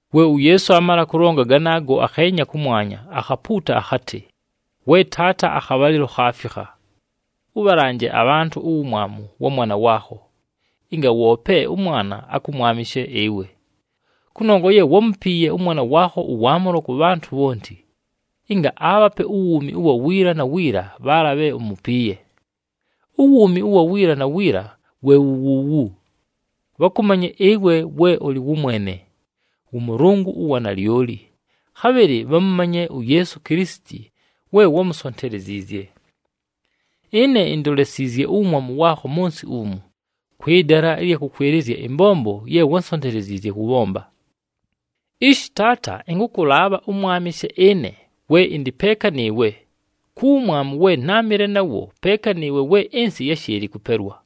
We uYeesu aamala kʉlonga ganaago, akheenya kʉmwanya, akhapuuta akhatɨ, “We Taata, akhabhalɨlo khaafikha. Ʉbhalanje abhantʉ uwumwamu wa mwana waakho, ɨnga woope ʉMwana akʉmwamɨshe ɨwe. Kʉnongwa ye wámupiiye ʉMwana waakho ʉwaamʉlo kʉ bhantʉ bhonti, ɨnga aabhape uwuumi ʉwa wiila na wiila bhaala bhe umupiiye. Uwuumi ʉwa wiila na wiila we wu wuuwu, bhakʉmanye ɨwe we ʉlɨ wʉmwene, wʉ Mʉlʉngʉ ʉwa nalyoli, khabhɨlɨ bhamʉmanye uYeesu Kilisiti we wámusonteleziizye. Ɨne indolesiizye uwumwamu waakho mʉ nsɨ umu, kwɨ dala ɨlya kʉkwɨlɨzya ɨmbombo ye wánsonteleziizye kʉbhomba. Ishi Taata, ɨnkʉkʉlaabha ʉmwamɨshe ɨne we ɨndɨ peeka nɨɨwe ku wumwamu we náamɨle nawo peeka nɨɨwe we ɨnsɨ yáshɨɨlɨ kʉpelwa.”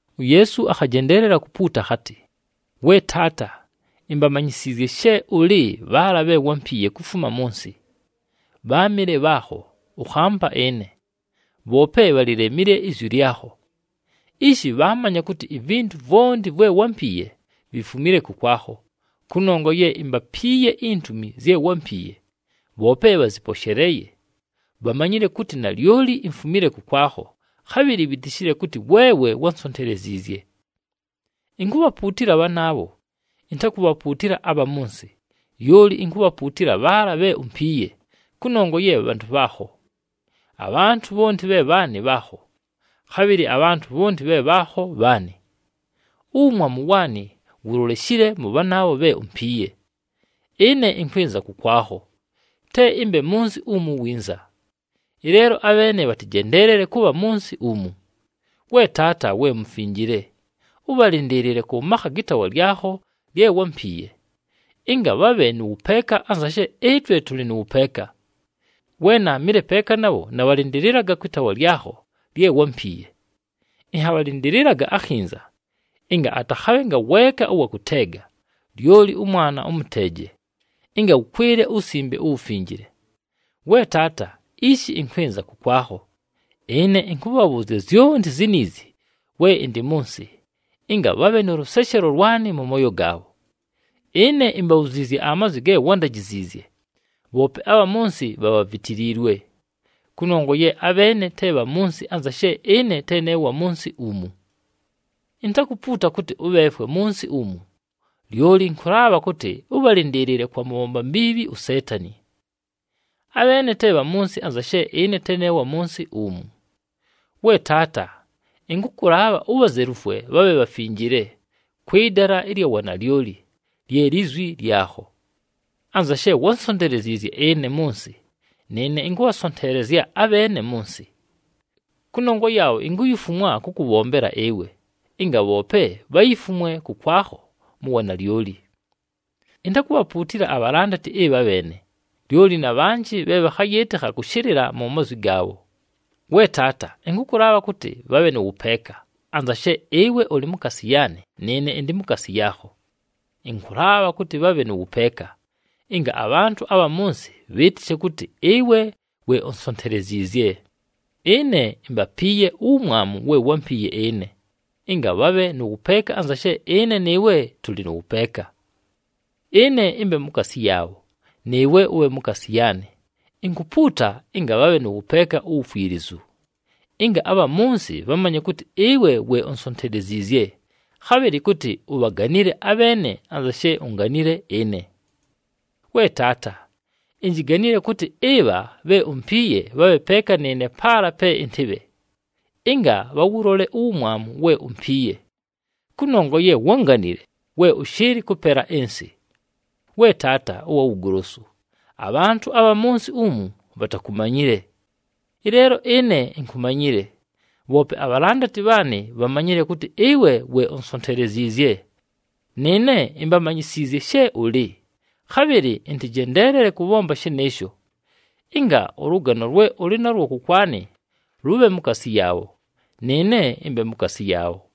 UYeesu akhajendeelela kupuuta akhatɨ, “We Taata, imbamanyisiizye she ʉlɨ bhaala bhe wámpiiye kufuma mʉ nsɨ. Bháamɨle bhaakho, ʉkhampa ɨne. Bhoope bhalilemile izwi lyakho. Ishi bhaamanya kʉtɨ ivintu vwonti vwe wámpiiye, vifumile kʉkwakho, kʉnongwa ye imbapiiye intumi zye wámpiiye. Bhoope bhazɨposheleeye, bhamanyile kʉtɨ nalyoli imfumile kʉkwakho, khabhɨlɨ bhitishile kʉtɨ weewe wánsonteleziizye. Inkubhapuutila bhanaabho, intakubhapuutila abha mʉ nsɨ, lyoli inkubhapuutila bhaala bhe umpiiye, kʉnongwa ye bhantʉ bhaakho. Abhantʉ bhonti bhe bhaanɨ, bhaakho, khabhɨlɨ abhantʉ bhonti bhe bhaakho, bhaanɨ. Uwumwamu waanɨ wuloleshile mʉ bhanaabho bhe umpiiye. Ɨne ɨnkwɨnza kʉkwakho, te ɨmbe mʉ nsɨ umu winza. Ɨleelo abheene bhatɨjendeelele kʉbha mʉ nsɨ umu. We Taata we Mufinjile, ʉbhalɨndɨɨlɨle kʉ makha gɨ taawa lyakho lye wámpiiye, ɨnga bhabhe nʉ wʉpeeka anza she ɨtwe tʉlɨ nʉ wʉpeeka. We naamɨle peeka nabho, nabhalɨndɨlɨlaga kwɨ taawa lyakho lye wámpiiye. Ɨnhabhalɨndɨlɨlaga akhinza ɨnga atakhabhe ngaweeka ʉwa kʉteega, lyoli ʉmwana ʉmʉteeje, ɨnga wʉkwɨle uWusimbe uWufinjile. “We Taata, ishi ɨnkwɨnza kʉkwakho. Ɨne ɨnkʉbhabhʉʉzya zyonti ziniizi we ɨndɨ mʉ nsɨ, ɨnga bhabhe nʉ lʉseshelo lwanɨ mʉ mooyo gaabho. Ɨne imbabhuziizye amazwi ge wándajiziizye, bhoope abha mʉ nsɨ bhabhavitiliilwe, kʉnongwa ye abheene te bha mʉ nsɨ anza she ɨne te ne wa mʉ nsɨ umu. Intakupuuta kʉtɨ ʉbheefwe mʉ nsɨ umu, lyoli ɨnkʉlaabha kʉtɨ ʉbhalɨndɨɨlɨle kwa mʉbhomba mbiibhi uSeetani. Abheene te bha mʉ nsɨ anza she ɨne te ne wa mʉ nsɨ umu. We Taata, ɨnkʉkʉlaabha ubhazelufwe bhabhe bhafinjile, kwɨ dala ɨlya wanalyoli, lye lizwi lyakho. Anza she wánsonteleziizye ɨne mʉ nsɨ, nɨɨne ɨnkʉbhasonteelezya abheene mʉ nsɨ. Kʉnongwa yaabho, inkuyifumwa kʉkʉbhombela ɨwe, ɨnga bhoope bhayifumwe kʉkwakho mu wanalyoli. “Intakubhapuutila abhalandati ɨbha bheene, lyoli na bhanjɨ bhe bhakhayɨɨtɨkha kʉshɨlɨla mu mazwi gaabho. We Taata, ɨnkʉkʉlaabha kʉtɨ bhabhe nʉ wʉpeeka, anza she ɨwe ʉlɨ mukaasi yaanɨ nɨɨne ɨndɨ mukaasi yaakho. Ɨnkʉlaabha kʉtɨ bhabhe nʉ wʉpeeka, ɨnga abhantʉ abha mʉ nsɨ bhɨɨtɨshe kʉtɨ ɨwe we unsonteleziizye. Ɨne imbapiiye uwumwamu we wámpiiye ɨne, ɨnga bhabhe nʉ wʉpeeka anza she ɨne nɨɨwe tʉlɨ nʉ wʉpeeka. Ɨne ɨmbe mukaasi yaabho, nɨɨwe ʉbhe mukaasi yaanɨ. Inkupuuta ɨnga bhabhe nʉ wʉpeeka uwukwilizu, ɨnga abha mʉ nsɨ bhamanye kʉtɨ ɨwe we unsonteleziizye, khabhɨlɨ kʉtɨ ubhaganile abheene anza she unganile ɨne. “We Taata, injiganile kʉtɨ ɨbha bhe umpiiye bhabhe peeka nɨɨne paala pe ɨntɨbhe, ɨnga bhawʉlole uwumwamu we umpiiye. Kʉnongwa ye wánganile we ʉshɨɨlɨ kʉpela ɨnsɨ. We Taata ʉwa Wugolosu, abhantʉ abha mʉ nsɨ umu bhatakumanyile. Ɨleelo ɨne inkumanyile, bhoope abhalandati bhaanɨ bhamanyile kʉtɨ ɨwe we unsonteleziizye. Nɨɨne imbamanyisiizye she ʉlɨ, khabhɨlɨ ɨntɨjendeelele kʉbhomba shɨnɨɨsho, ɨnga ʉlʉgano lwe ʉlɨ nalwo kʉkwanɨ lʉbhe mukaasi yaabho, nɨɨne ɨmbe mukaasi yaabho.”